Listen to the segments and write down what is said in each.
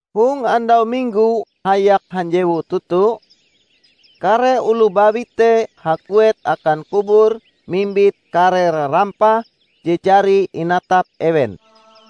Hong andau Minggo hayak hanjewu toto, kare oloh bawi te haguet akan kubur mimbit kare rarampah je jari inatap ewen.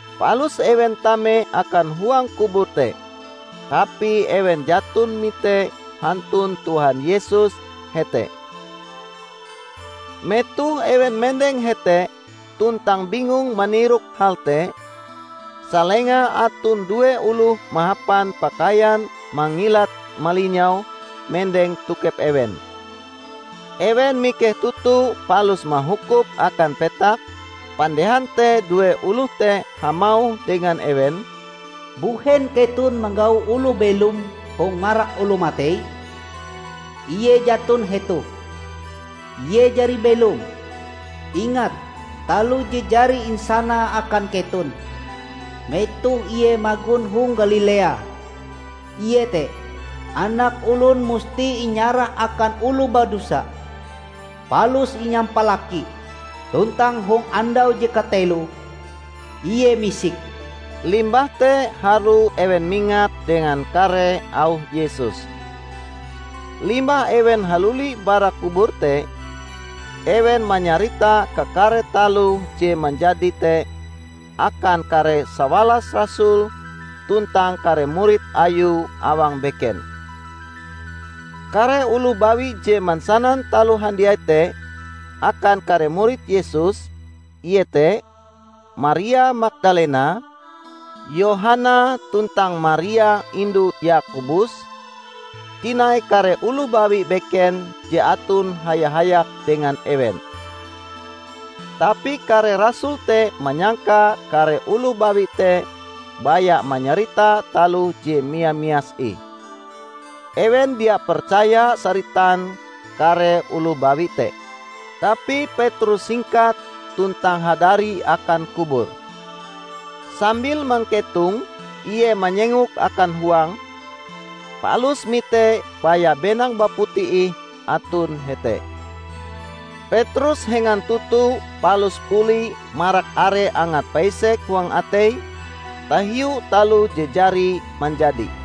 Palus ewen tame akan huang kubur te, tapi ewen jaton mite hantun Tuhan Yesus hete. Metoh ewen mendeng hete tuntang bingung manirok hal te, salenga aton due oloh mahapan pakaian mangilat-malinyau mendeng tokep ewen. Ewen mikeh toto palus mahukup akan petak, pandehan te due oloh te hamauh dengan ewen, "Mbuhen keton manggau oloh belom hong marak oloh matei? Ie jaton hetoh. Ie jari belom! Ingat taloh je jari insanae akan keton metoh Ie magon hong Galilea, iete 'Anak Olon musti inyarah akan oloh badosa, palus inyampalaki, tuntang hong andau je kateloe Ie misik.' " Limbah te harue ewen mingat dengan kare auh Yesus. Limbah ewen haluli bara kubur te, ewen manyarita kakare taloh je manjadi te akan kare sawalas rasul tuntang kare murid Ayue awang beken. Kare oloh bawi je mansanan taloh handiai te akan kare murid Yesus, iete: Maria Magdalena, Yohana tuntang Maria indu Yakobus, tinai kare oloh bawi beken je aton haya-hayak dengan ewen. Tapi kare rasul te manyangka kare oloh bawi te baya manyarita taloh je mia-mias ih. Ewen dia percaya saritan kare oloh bawi te. Tapi Petrus hingkat tuntang hadari akan kubur. Sambil mangketong ie manyengok akan huang, palus mite baya benang baputi ih aton hete. Petrus hengan toto palus buli marak are angat paisek huang ateie tahiu taloh je jari manjadi.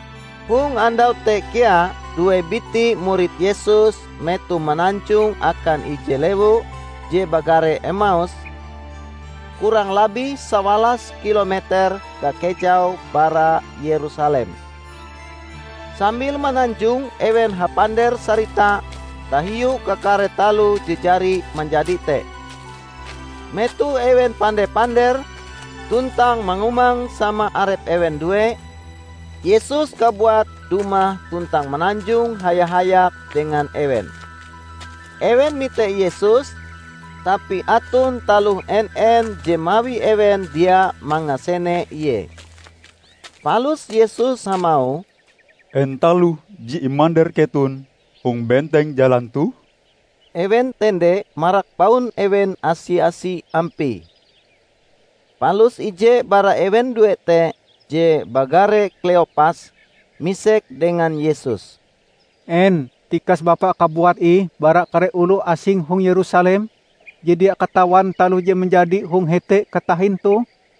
Hong andau te kea due biti murid Yesus metoh mananjong akan ije lewu je bagare Emaus, kurang labih sawalas kilometer kakejaue bara Yerusalem. Sambil mananjong ewen hapander-sarita tahiu kakare taloh je jari manjadi te. Metoh ewen pande-pander tuntang mangumang sama arep ewen due, Yesus kabuat dumah tuntang mananjong haya-hayak dengan ewen. Ewen mite Yesus tapi aton taloh en-en je mawi ewen dia mangasene Ie. Palus Yesus hamauh, "En taloh je imander keton hong benteng jalan toh?" Ewen tende marak baun ewen asi-asi ampie. Palus ije bara ewen due te je bagare Kleopas, misek dengan Yesus, "En tikas Bapa kabuat ih bara kare oloh asing hong Yerusalem je dia katawan taloh je manjadi hong hete katahin toh?"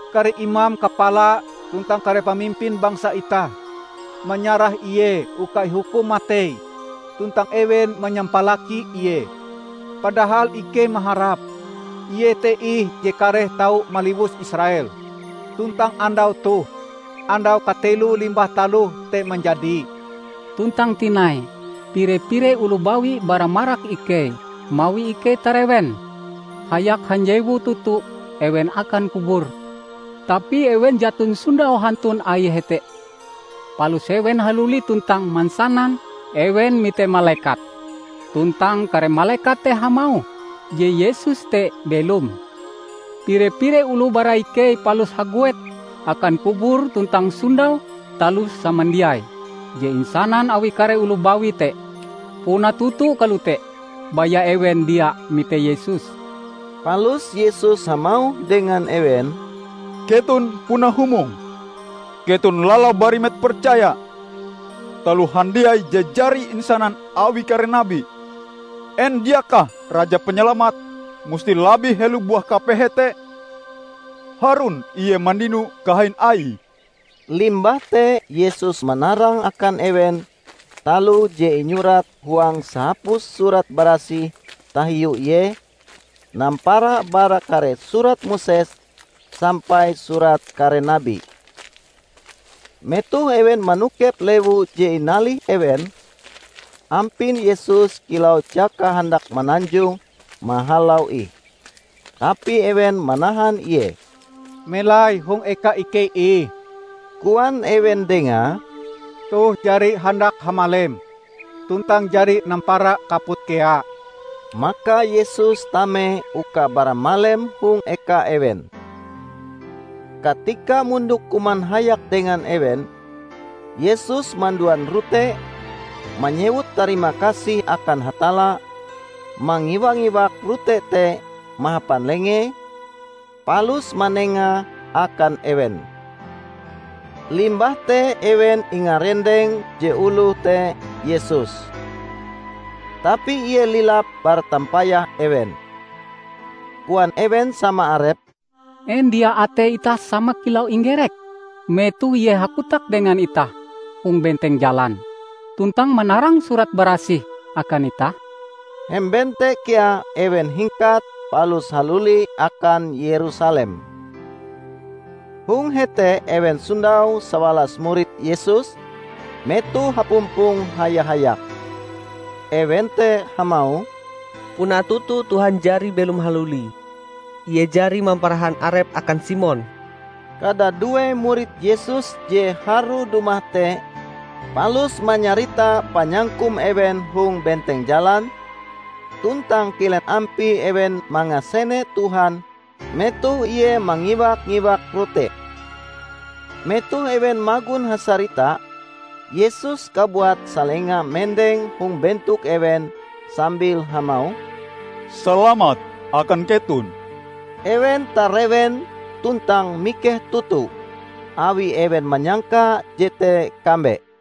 Kare imam kapala tuntang kare pamimpin bangsa itah manyarah Ie uka ihukum matei, tuntang ewen manyampalaki Ie! Padahal ikei maharap, Ie te ih je kareh tau maliwus Israel! Tuntang andau toh, andau kateloe limbah taloh te manjadi. Tuntang tinai, pire-pire oloh bawi bara marak ikei mawi ikei tarewen. Hayak hanjewu toto ewen akan kubur, tapi ewen jaton sondau hantun Aie hete. Palus ewen haluli tuntang mansanan ewen mite malekat, tuntang kare malekat te hamauh je Yesus te belom. Pire-pire oloh bara ikei palus haguet akan kubur tuntang sondau taloh samandiai je insanan awi kare oloh bawi te, puna toto kalote, baya ewen dia mite Yesus." Palus Yesus hamauh dengan ewen, "Keton puna humong! Keton lalau barimet percaya taloh handiai je jari insanan awi kare nabi! En diakah Raja Panyalamat musti labih helo buah kapehe te, harun Ie mandino kahain Aie?" Limbah te Yesus manarang akan ewen taloh je inyurat huang sahapus Surat Barasih tahiu Ie, nampara bara kare surat Moses sampai surat kare nabi. Metoh ewen manokep lewu je inalih ewen, ampin Yesus kilau jaka handak mananjong mahalau ih, tapi ewen manahan Ie. "Melai hong eka ikei ih," koan ewen Dengae, "toh jari handak hamalem tuntang jari nampara kaput kea." Maka Yesus tame uka baramalem hong eka ewen. Katika mondok kuman hayak dengan ewen, Yesus manduan rote, manyewut tarimakasih akan Hatalla, mangiwak-mangiwak rote te mahapan lengee, palus manengae akan ewen. Limbah te ewen ingarendeng je oloh te Yesus. Tapi ie lilap bara tampayah ewen. Koan ewen sama arepe, "En dia atei itah sama kilau inggerek, metoh Ie hakotak dengan itah hong benteng jalan, tuntang manarang Surat Barasih akan itah?" Hemben te kea ewen hingkat palus haluli akan Yerusalem. Hong hete ewen sondau sawalas murid Yesus metoh hapumpong haya-hayak. Ewen te hamauh, "Puna toto Tuhan jari belom haluli! Ie jari mamparahan Arepe akan Simon!" Kadadue murid Yesus je harue dumah te palus manyarita panyangkum ewen hong benteng jalan, tuntang kilen ampie ewen mangasene Tuhan metoh Ie mangiwak-mangiwak rote. Metoh ewen magon hasarita, Yesus kabuat salenga mendeng hong bentok ewen sambil hamauh, "Salamat akan keton!" Ewen tarewen tuntang mikeh toto, awi ewen manyangka jete kambe.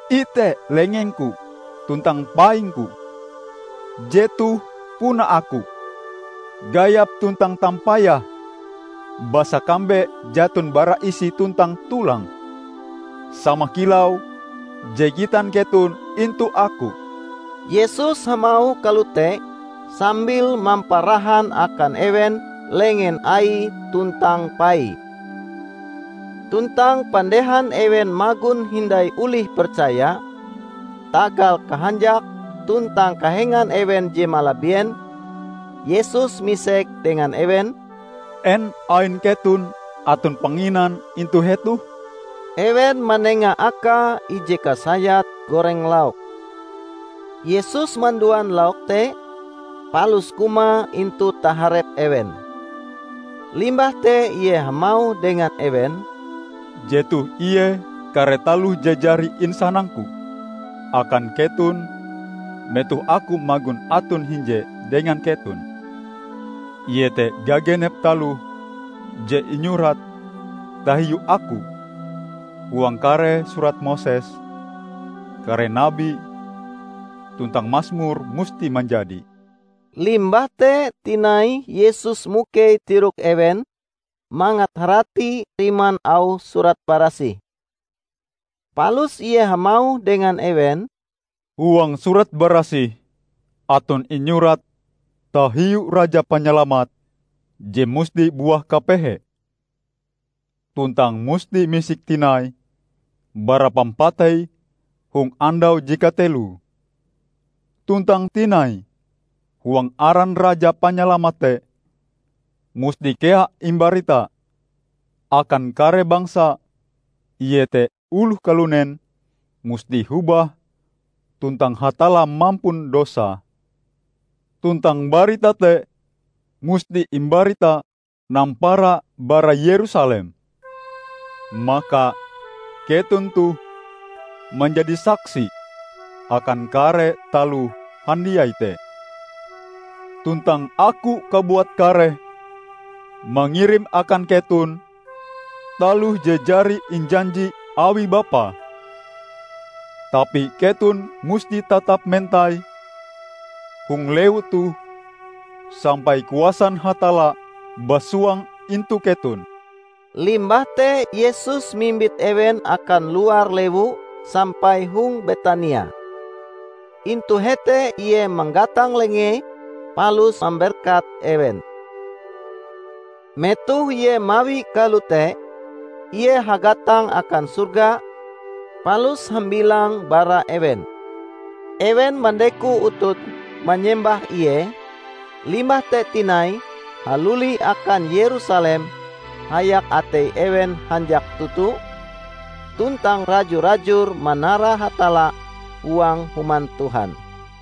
Ite lengeng-Ku tuntang paing-Ku, jetoh puna Aku! Gayap tuntang tampayah, basa kambe jaton bara isi tuntang tulang, sama kilau je gitan keton intu Aku." Yesus hamauh kalote sambil mamparahan akan ewen lengen Aie tuntang paie. Tuntang pandehan ewen magon hindai olih percaya, tagal kahanjak tuntang kahengan ewen je malabien, Yesus misek dengan ewen, "En ain keton aton panginan intu hetoh?" Ewen manenga Akae ije kasayat goreng lauk. Yesus manduan lauk te, palus kumae intu taharep ewen. Limbah te Ie hamauh dengan ewen, "Jetoh ie kare taloh je jari insanang-Ku akan keton metoh Aku magon aton hinje dengan keton: iete gagenep taloh je inyurat tahiu Aku huang kare Surat Moses, kare nabi, tuntang Masmur, musti manjadi." Limbah te tinai Yesus mukei tirok ewen mangat harati riman auh Surat Barasih. Palus Ie hamauh dengan ewen, "Huang Surat Barasih aton inyurat tahiu Raja Panyalamat je musti buah kapehe, tuntang musti misik tinai bara pampatei hong andau je kateloe. Tuntang tinai huang aran Raja Panyalamat te musti kea imbarita akan kare bangsa iete oloh kalunen musti hobah tuntang Hatalla mampun dosa. Tuntang barita te musti imbarita nampara bara Yerusalem. Maka keton toh manjadi saksi akan kare taloh handiai te. Tuntang Aku kabuat kareh mangirim akan keton taloh je jari injanji awi Bapa. Tapi keton musti tatap mentai hong lewu toh sampai kuasan Hatalla basuang intu keton." Limbah te Yesus mimbit ewen akan luar lewu sampai hong Betania. Intu hete Ie manggatang lengee palus mamberkat ewen. Metoh Ie mawie kalote, Ie hagatang akan sorga, palus hambilang bara ewen. Ewen mandeko utute manyembah Ie, limbah te tinai haluli akan Yerusalem hayak atei ewen hanjak toto, tuntang raju-rajur manara Hatalla huang Human Tuhan.